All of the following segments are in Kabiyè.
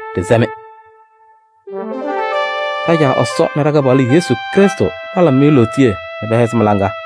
Ɖɩsɛ-mɩ: ɖa-Caa Ɛsɔ nɛ ɖa-Kɩpaɣlʋ Yesu Krɩstʋ palabɩ-mɩ lootiye nɛ pɛhɛzɩ mɩ-laŋa.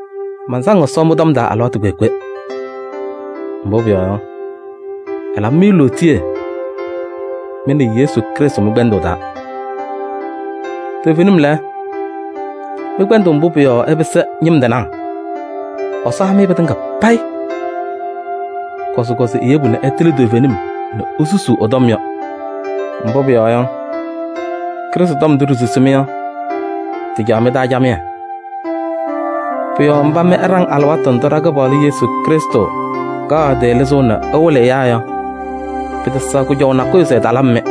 Mansaŋ Ɛsɔ mɩ-tɔm taa alɩwaatʋ kpeekpe. Mbʋ pʋyɔɔ yɔ, ɛlabɩ-mɩ lootiye mɩ nɛ Krɩstʋ Yesu mɩ-kpɛndʋʋ taa. Toovenim lɛ, mɩ-kpɛndʋʋ mbʋ pʋ-yɔɔ ɩpɩsɩ ñɩm tɩnaa, Ɛsɔ ha-mɩ pɩtɩŋa payɩ. Kɔzɩkɔzɩ eyebu nɛ ɩtɩlɩ toovenim nɛ isusuu ɛ-tɔm yɔ. Mbʋ pʋyɔɔ yɔ, Krɩstʋ tɔm ndʋ ɖisusi-mɩ yɔ, tɩcaɣ mɩ-taa camɩyɛ. Pʋ-yɔɔ mba mɩ ɩɖaŋ alɩwaatʋ ndʋ ɖa-Kɩpaɣlʋ Yesu Krɩstʋ kaɣ ɛ-tɩ lɩzʋʋ nɛ ɛwɩlɩ ɛyaa yɔ, pɩtɛsɛɣ kʋjɔʋ nakʋyʋ se Ɛsɔ talabɩ-mɩ.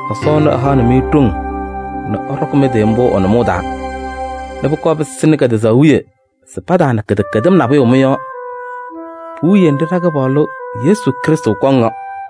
Ɛsɔ ɛnʋ ɛhaɣnɩ-mɩ ɖoŋ nɛ ɩɖɔkɩ mɩ-tɩ mbʋ ɛ-nʋmɔʋ taa nɛ pʋkɔɔ pɩsɩnɩ kɛtɛzaɣ wiye se pataana kɩdɛkɛdɩm nabʋyʋ mɩ-yɔɔ puwiye nɖɩ ɖa-Kɩpaɣlʋ Yesu Krɩstʋ kɔŋ yɔ.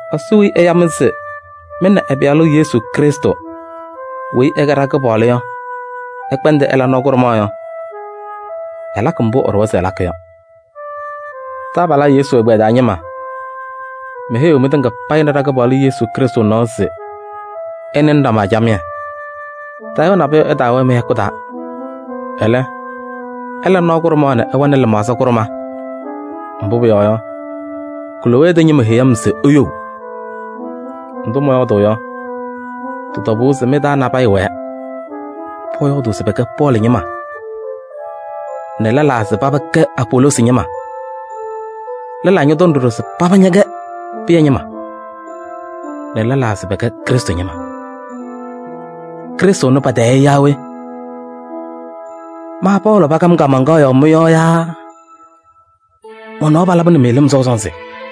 Ɛsɔ weyi ɛya-mɩ se mɩ nɛ ɛ-Pɩyalʋ Yesu Krɩstʋ weyi ɛkɛ ɖa-Kɩpaɣlʋ yɔ ɩkpɛndɩ ɩla nɔɔ kʋɖʋmaɣ yɔ, ɛlakɩ mbʋ ɛɖʋwa se ɛlakɩ yɔ. Taabalaa Yesu ɛgbɛyɛ taa ñɩma, meheyiɣ mɩtɩŋa payɩ nɛ ɖa-Kɩpaɣlʋ Yesu Krɩstʋ nɔɔ se ɩnɩnɩ ɖama camɩyɛ. Tayʋʋ nabʋyʋ ɛtaawɛɛ mɩ-hɛkʋ taa. Ɛlɛ, ɩla nɔɔ kʋɖʋmaɣ nɛ ɩwɛnɩ lɩmaɣza kʋɖʋma. Mbʋ pʋyɔɔ yɔ, Klowee tɛ ñɩma heyi-m se iyou. Ndʋ mɔyɔɔdʋʋ yɔ, tɩ-tɔbʋʋ se mɩ-taa nabɛyɛ wɛɛ pɔyɔɔdʋʋ se pɛkɛ Pɔɔlɩ ñɩma nɛ lɛlaa se paba kɛ Apoloosi ñɩma. Lɛlaa ñɔtɔŋ ɖɔɖɔ se paba ñɛkɛ Pɩyɛ ñɩma nɛ lɛlaa se pɛkɛ Krɩstʋ ñɩma. Krɩstʋ ɛnʋ patayɩ-ɩ yaa we? Ma Pɔɔlɩ pakam kaamaŋkaɣ yɔɔ mɩ-yɔɔ yaa mɔ-nɔɔ palabɩnɩ-mɩ lɩm sɔʋ sɔnzɩ?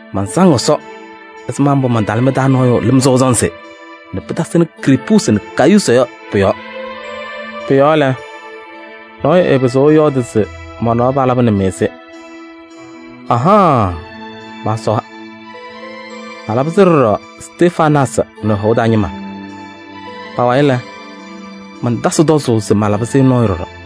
Mansaŋ Ɛsɔ ɛzɩma mbʋ mantala mɩ-taa nɔɔyʋ lɩm sɔʋ sɔnzɩ nɛ pɩtasɩnɩ Krispuusi nɛ Gayuusi yɔ pʋ-yɔɔ. Pʋ-yɔɔ lɛ, nɔɔyʋ ɛɛpɩzɩɣ ɛyɔɔdɩ se mɔ-nɔɔ palabɩnɩ-mɩ-sɩ. Ahaɣaɣ, maasɔwa! Malabɩ-sɩ ɖɔɖɔ Stefanaasɩ nɛ ɛ-hɔʋ taa ñɩma. Pa-wayɩ lɛ, mantatasɩ tɔzʋʋ se malabɩ-sɩ nɔɔyʋ ɖɔɖɔ.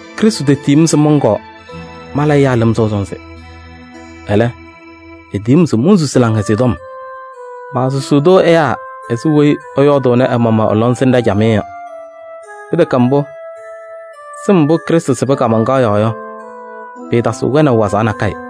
Krɩstʋ tetiyi-m se mɔnkɔɔ mala ɛyaa lɩm sɔʋ sɔnzɩ. Ɛlɛ, etiyi-m se monsusi Laŋhɛzɩyɛ Tɔm. Maasusuu-tʋ ɛyaa ɛzɩ weyi ɛyɔɔdʋʋnɩ ɛ-maɣmaɣ ɛ-lɔŋsɩnɖɛ camɩyɛ yɔ. Pɩtɛkɛ mbʋ, sɩm mbʋ Krɩstʋ sɩbɩ kaamaŋkaɣ yɔɔ yɔ, pɩɩtasɩɣ wɛnaʋ wazaɣ nakɛyɛ.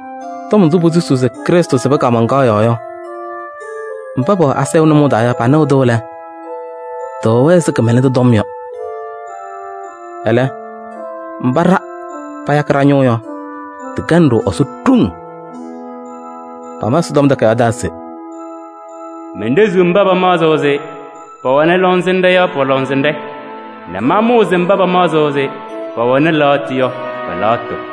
Tɔm ndʋ posusuu se Krɩstʋ sɩbɩ kaamaŋkaɣ yɔɔ yɔ, mba pɛwɛ asayʋʋ nʋmɔʋ taa yɔ, panɩɣ-tʋ lɛ, tɩwɛ-wɛ ɛzɩ kɩmɛlɛndʋ tɔm yɔ. Ɛlɛ, mba ɖa payakɩ ɖa-ñʋʋ yɔ, tɩkɛnɩ-ɖʋ Ɛsɔ ɖoŋ. Pama Ɛsɔtɔm Takayaɣ taa se: “Menɖeziɣ mba pamaɣzɩɣ se pɛwɛnɩ lɔŋsɩnɖɛ yɔ pɔ-lɔŋsɩnɖɛ nɛ mamʋʋzɩ mba pamaɣzɩɣ se pɛwɛnɩ lɛɣtʋ yɔ pɛ-lɛɣtʋ.”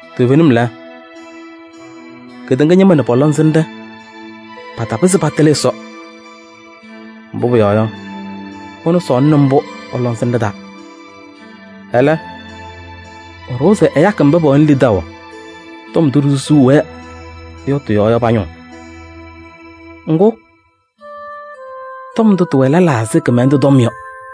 Toovenim lɛ, kedeŋa ñɩma nɛ pɔ-lɔŋsɩnɖɛ patapɩzɩ patɩlɩ Ɛsɔ. Mbʋ pʋyɔɔ yɔ, ɛnʋ sɔɔlɩnɩ mbʋ ɛ-lɔŋsɩnɖɛ taa. Ɛlɛ, ɛɖʋwa se ɛyakɩ mba pɛwɛnɩ lidaʋ tɔm ndʋ ɖisusuu-wɛ yɔ tɩ-yɔɔ yɔ pa-ñʋʋ. Ŋgʋ, tɔm ndʋ tɩwɛ lɛlaa ɛzɩ kɩmɛlɛndʋ tɔm yɔ.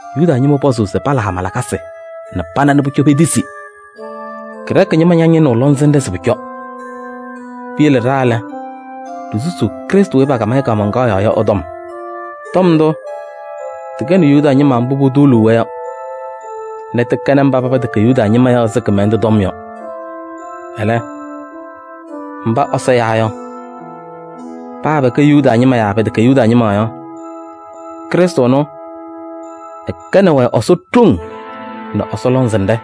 Yuda ñɩma pɔzʋʋ se pala hama lakasɩ nɛ pana nɛ pʋcɔ petisi, Grɛɛkɩ ñɩma ñañɩnɩɣ lɔŋsɩnɖɛ se pʋcɔ. Piyele ɖa lɛ, ɖisusuu Krɩstʋ weyi pakam-ɩ kaamaŋkaɣ yɔɔ yɔ ɛ-tɔm. Tɔm ndʋ, tɩkɛnɩ Yuda ñɩma mbʋ putuuluu-wɛ yɔ nɛ tɩkɛnɩ mba pɛtɛkɛ Yuda ñɩma yɔ ɛzɩ kɩmɛlɛndʋ tɔm yɔ. Ɛlɛ, mba Ɛsɔ yawa yɔ, paa pɛkɛ Yuda ñɩma yaa pɛtɛkɛ Yuda ñɩma yɔ, Krɩstʋ ɛnʋ, ɛkɛnɩ-wɛ Ɛsɔ ɖoŋ nɛ Ɛsɔ lɔŋsɩnɖɛ.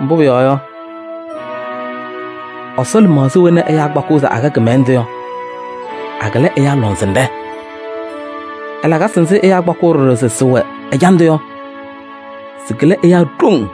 Mbʋ pʋyɔɔ yɔ, Ɛsɔ lɩmaɣza wena ɛyaa kpakɩɣ se akɛ kɩmɛlɛndʋ yɔ, akɩlɩ ɛyaa lɔŋsɩnɖɛ. Ɛ-lakasɩ nzɩ ɛyaa kpakɩɣ ɖɔɖɔ se sɩwɛ ɛjandʋ yɔ, sɩkɩlɩ ɛyaa ɖoŋ.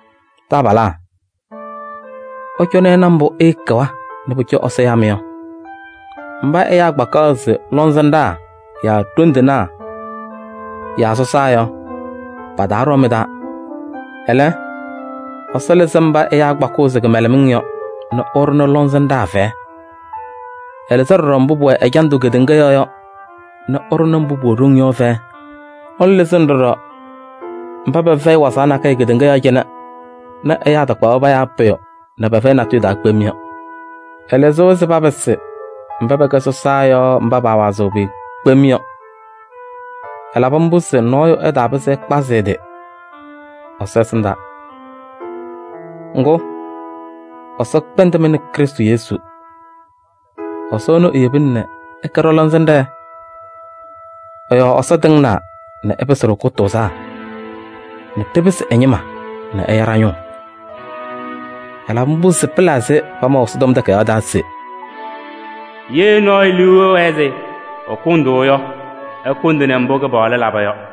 Taabalaa, ɩcɔnɩ ɩna mbʋ ɩɩkɛwa nɛ pʋcɔ Ɛsɔ yaa-mɩ yɔ. Mba ɛyaa kpakaɣ se lɔŋsɩnɖaa yaa ɖoŋ tɩnaa yaa sɔsaa yɔ, pataaɖɔɔ mɩ-taa. Ɛlɛ, Ɛsɔ lɩzɩ mba ɛyaa kpakɩɣ se kɩmɛlɛmɩŋ yɔ nɛ ɛɖʋnɩ lɔŋsɩnɖaa fɛyɛ. Ɛlɩzɩ ɖɔɖɔ mbʋ pʋwɛ ɛjandʋ kedeŋa yɔɔ yɔ nɛ ɛɖʋnɩ mbʋ pʋwɛ ɖoŋ yɔ fɛyɛ. Ɛnʋ lɩzɩnɩ ɖɔɖɔ mba pɛfɛyɩ wazaɣ nakɛyɛ kedeŋa yɔɔ cɩnɛ nɛ ɛyaa takpaɣ-wɛ payaa pʋyʋ nɛ pɛfɛyɩ natʋyʋ taa kpem yɔ. Ɛlɩzɩ-wɛ se papɩsɩ mba pɛkɛ sɔsaa yɔ mba paawazɩɣ pʋyʋ kpem yɔ. Ɛlabɩ mbʋ se nɔɔyʋ ɛtaapɩzɩ ɛtasɩ ɛ-tɩ kpazʋʋ Ɛsɔ ɛsɩndaa. Ŋgʋ, Ɛsɔ kpɛndɩ mɩ nɛ Krɩstʋ Yesu. Ɛsɔ ɛnʋ eyebina se ɛkɛ ɖɔ-lɔŋsɩnɖɛ. Ɛ-yɔɔ Ɛsɔ tɩŋnaa nɛ ɛpɩsɩ-ɖʋ kʋtʋʋzaa nɛ ɖɩpɩsɩ ɛ-ñɩma nɛ ɛya ɖa-ñʋʋ. Ɛlabɩ mbʋ se pɩla ɛzɩ pamaʋ Ɛsɔtɔm Takayaɣ taa se: “Ye nɔɔyʋ liu ɛwɛɛ se ɛkʋndʋʋ yɔ, ɛkʋndɩnɩ mbʋ Kɩpaɣlʋ laba yɔ.”